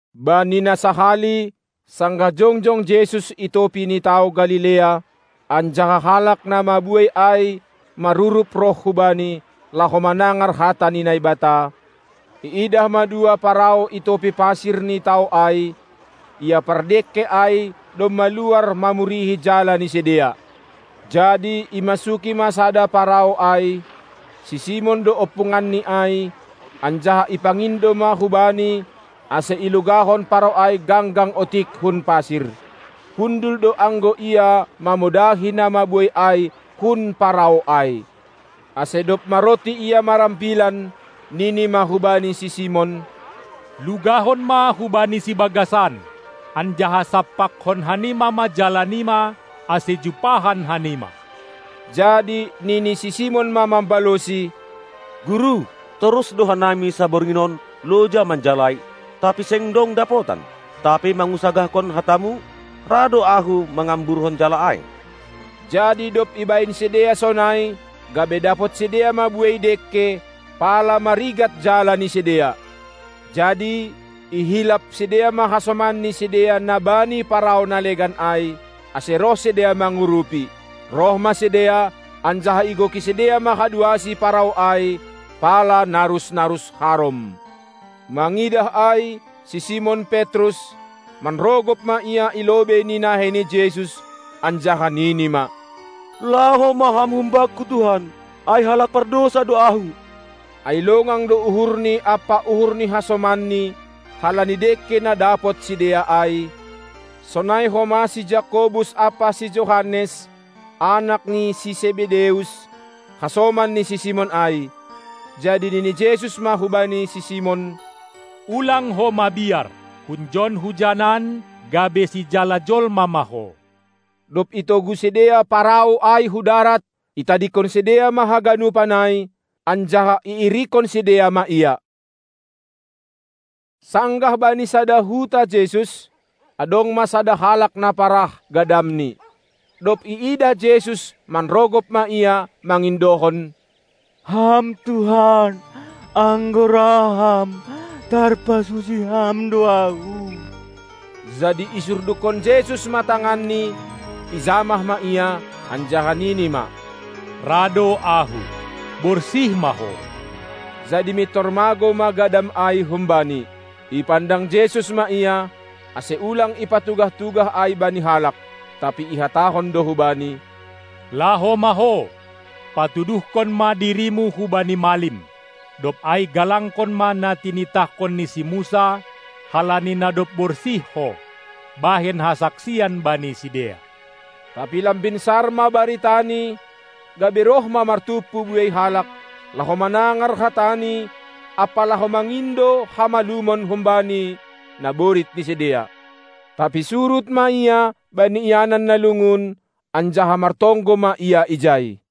Bani na sahali, sanggah jongjong Jesus i topi ni tao Galilea, anjaha halak na mabuei ai marurup roh hu Bani, laho manangar hata ni Naibata, iidah ma dua parau i topi pasir ni tao ai; ia pardengke ai domma luar mamurihi jala ni sidea. Jadi imasuki ma sada parau ai, si Simon do ompunganni ai, anjaha ipangindo ma hubani, ase ilugahon parau ai ganggang otik hun pasir. Hundul do anggo Ia mamodahi na mabuei ai hun parau ai. Ase dob maronti Ia marambilan, nini ma hubani si Simon: Lugahon ma hubani sibagasan, anjaha sampakkon hanima ma jala nima, ase jumpahan hanima. Jadi nini si Simon ma mambalosi: Guru, torus do hanami saborngin on loja manjalai, tapi seng dong dapotan; tapi mangusagahkon hataMu ra do ahu mangamburhon jala ai. Jadi dob ibahen sidea sonai, gabe dapot sidea ma buei dengke, pala marigat jala ni sidea. Jadi ihilap sidea ma hasoman ni sidea na bani parau na legan ai, ase roh sidea mangurupi. Roh ma sidea, anjaha igoki sidea ma haduasi parau ai, pala narus-narus harom. Mangidah ai si Simon Petrus, manrogop ma ia i lobei ni nahei ni Jesus anjaha nini ma: Laho ma Ham humbakku Tuhan, ai halak pardousa do ahu! Ai longang do uhurni ampa uhur ni hasomanni halani dengke na dapot sidea ai, sonai homa si Jakobus ampa si Johannes, anak ni si Sebedeus, hasoman ni si Simon ai. Jadi nini Jesus ma hubani si Simon: Ulang ho mabiar! Hunjon hujanan gabe sijala jolma ma ho. Dob itogu sidea parau ai hu darat, itadingkon sidea ma haganupan ai, anjaha iirikkon sidea ma Ia. Sanggah bani sada huta Jesus, adong ma sada halak na parah gadamni. Dob iidah Jesus manrogop ma ia mangindohon: Ham Tuhan, anggo ra Ham, tarpasusi Ham do ahu! Jadi isurdukkon Jesus ma tanganNi, ijamah ma ia, anjaha nini ma: Ra do Ahu, borsih ma ho! Jadi mintor magou ma gadam ai humbani. Ipandang Jesus ma ia, ase ulang ipatugah-tugah ai bani halak. Tapi ihatahon do hubani: Laho ma ho, patuduhkon ma dirimu hubani malim. Dob ai galangkon ma na tinitahkon ni si Musa, halani na dob borsih ho, bahen hasaksian bani sidea! Tapi lambin sar ma baritani, gabe roh ma martumpu buei halak, laho manangar hataNi ampa laho mangindo hamalumon humbaNi naborit ni sidea. Tapi surut ma Ia bani ianan na lungun, anjaha martonggo ma Ia ijai.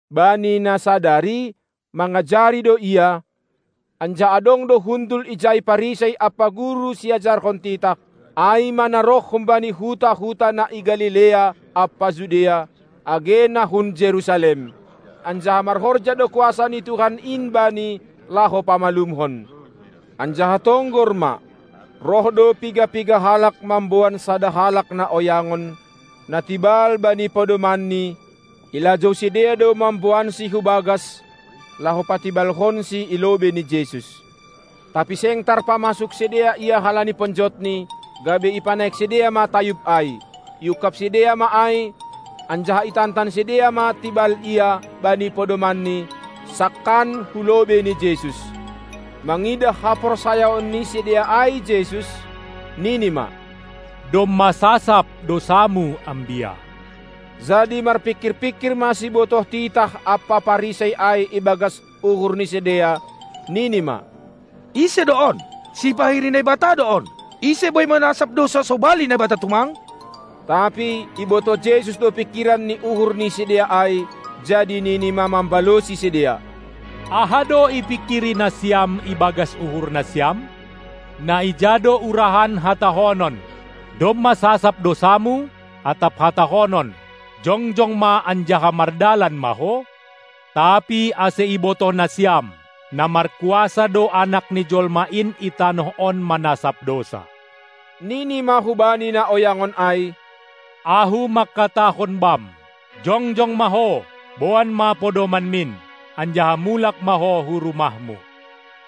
Bani na sadari mangajari do Ia, anjaha adong do hundul ijai Parisei ampa guru siajarhon titah, ai ma na roh humbani huta-huta na i Galilea ampa Judea, age na hun Jerusalem. Anjaha marhorja do kuasa ni Tuhan in Bani laho pamalumhon. Anjaha tonggor ma, roh do piga-piga halak mamboan sada halak na oyangon, na tibal bani podomanni; ilajou sidea do mamboansi hu bagas, laho patibalhonsi i lobei ni Jesus. Tapi seng tarpamasuk sidea ia halani ponjotni, gabe ipanaik sidea ma tayub ai. Iungkab sidea ma ai, anjaha itantan sidea ma tibal ia, bani podomanni, sangkan hu lobei ni Jesus. Mangidah haporsayaon ni sidea ai Jesus, nini ma: Domma sasap dousamu ambia! Jadi marpingkir-pingkir ma sibotoh titah ampa Parisei ai ibagas uhur ni sidea, nini ma: Ise do on? Sipahiri Naibata do on! Ise boi manasap dousa sobali Naibata tumang? Tapi ibotoh Jesus do pingkiran ni uhur ni sidea ai, jadi nini ma mambalosi sidea: Aha do ipingkiri nasiam ibagas uhur nasiam? Na ija do urahan hatahonon: Domma sasap dousamu, atap hatahonon: Jongjong ma anjaha mardalan ma ho? Tapi ase ibotoh nasiam, na markuasa do Anak ni jolma in i tanoh on manasap dousa, nini ma hubani na oyangon ai: Ahu mangkatahon bam: Jongjong ma ho, boan ma podomanmin, anjaha mulak ma ho hu rumahmu!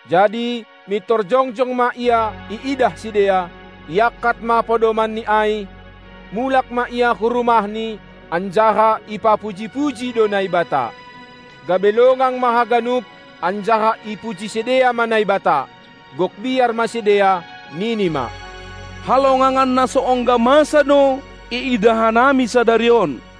Jadi mintor jongjong ma ia iidah sidea; iangkat ma podomanni ai, mulak ma ia hu rumahni, anjaha ipapuji-puji do Naibata. Gabe longang ma haganup, anjaha ipuji sidea ma Naibata. Gok biar ma sidea, nini ma: Halongangan na so ongga masa do iidah hanami sadari on.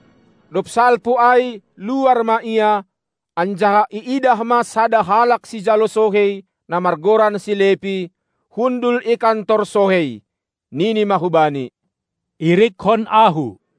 Dob salpu ai luar ma Ia, anjaha iidah ma sada halak sijalo sohei, na margoran si Lepi, hundul i kantor sohei. Nini ma hubani: Irikkon ahu!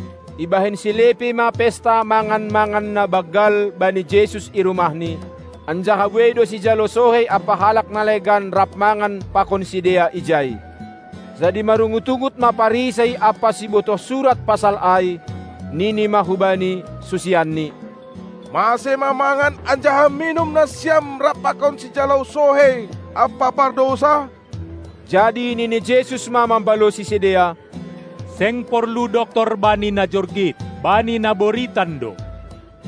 Ibahen si Lepi ma pesta mangan-mangan na banggal bani Jesus i rumahni, anjaha buei do sijalo sohei ampa halak na legan rap mangan pakon sidea ijai. Jadi marungut-ungut ma Parisei ampa sibotoh surat pasal ai, nini ma hubani susianni: Mase ma mangan anjaha minum nasiam rap pakon sijalo sohei ampa pardousa? Jadi nini Jesus ma mambalosi sidea: Seng porlu doktor bani na jorgit, bani na boritan do!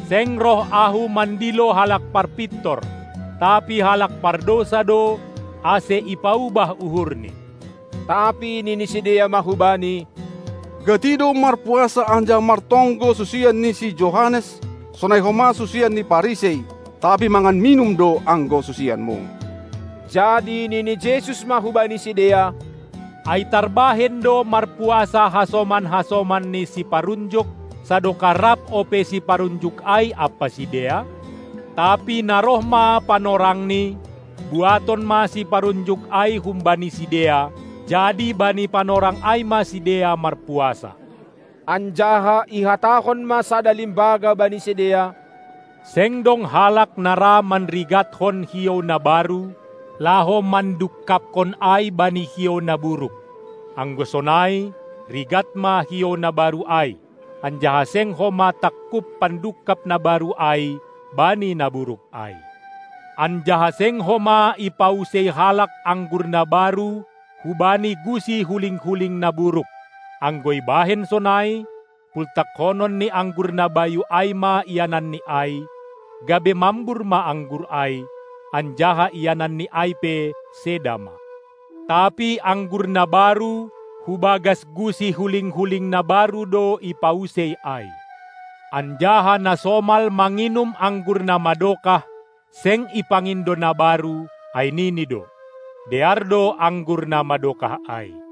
Seng roh Ahu mandilo halak parpintor, tapi halak pardousa do, ase ipaubah uhurni. Tapi nini sidea ma hu Bani: Gati do marpuasa anjaha martonggo susian ni si Johannes, sonai homa susian ni Parisei, tapi mangan minum do anggo susianMu. Jadi nini Jesus ma hubani sidea: Ai tarbahen do marpuasa hasoman-hasoman ni siparunjuk, sadokah rap ope siparunjuk ai ampa sidea? Tapi na roh ma panorangni, buaton ma siparunjuk ai humbani sidea, jadi bani panorang ai ma sidea marpuasa. Anjaha ihatahon ma sada limbaga bani sidea: Seng dong halak na ra manrigatkon hiou na baru, laho mandungkaphon ai bani hiou na buruk. Anggo sonai rigat ma hiou na baru ai, anjaha seng homa tangkup pandungkap na baru ai bani na buruk ai. Anjaha seng homa ipausei halak anggur na baru hubani gusi huling-huling na buruk; anggo ibahen sonai, pultakkonon ni anggur na bayu ai ma iananni ai, gabe mambur ma anggur ai, anjaha iananni ai pe seda ma. Tapi anggur na baru hubagas gusi huling-huling na baru do ipausei ai. Anjaha na somal manginum anggur na madokah seng ipangindo na baru, ai nini do: Dear do anggur na madokah ai.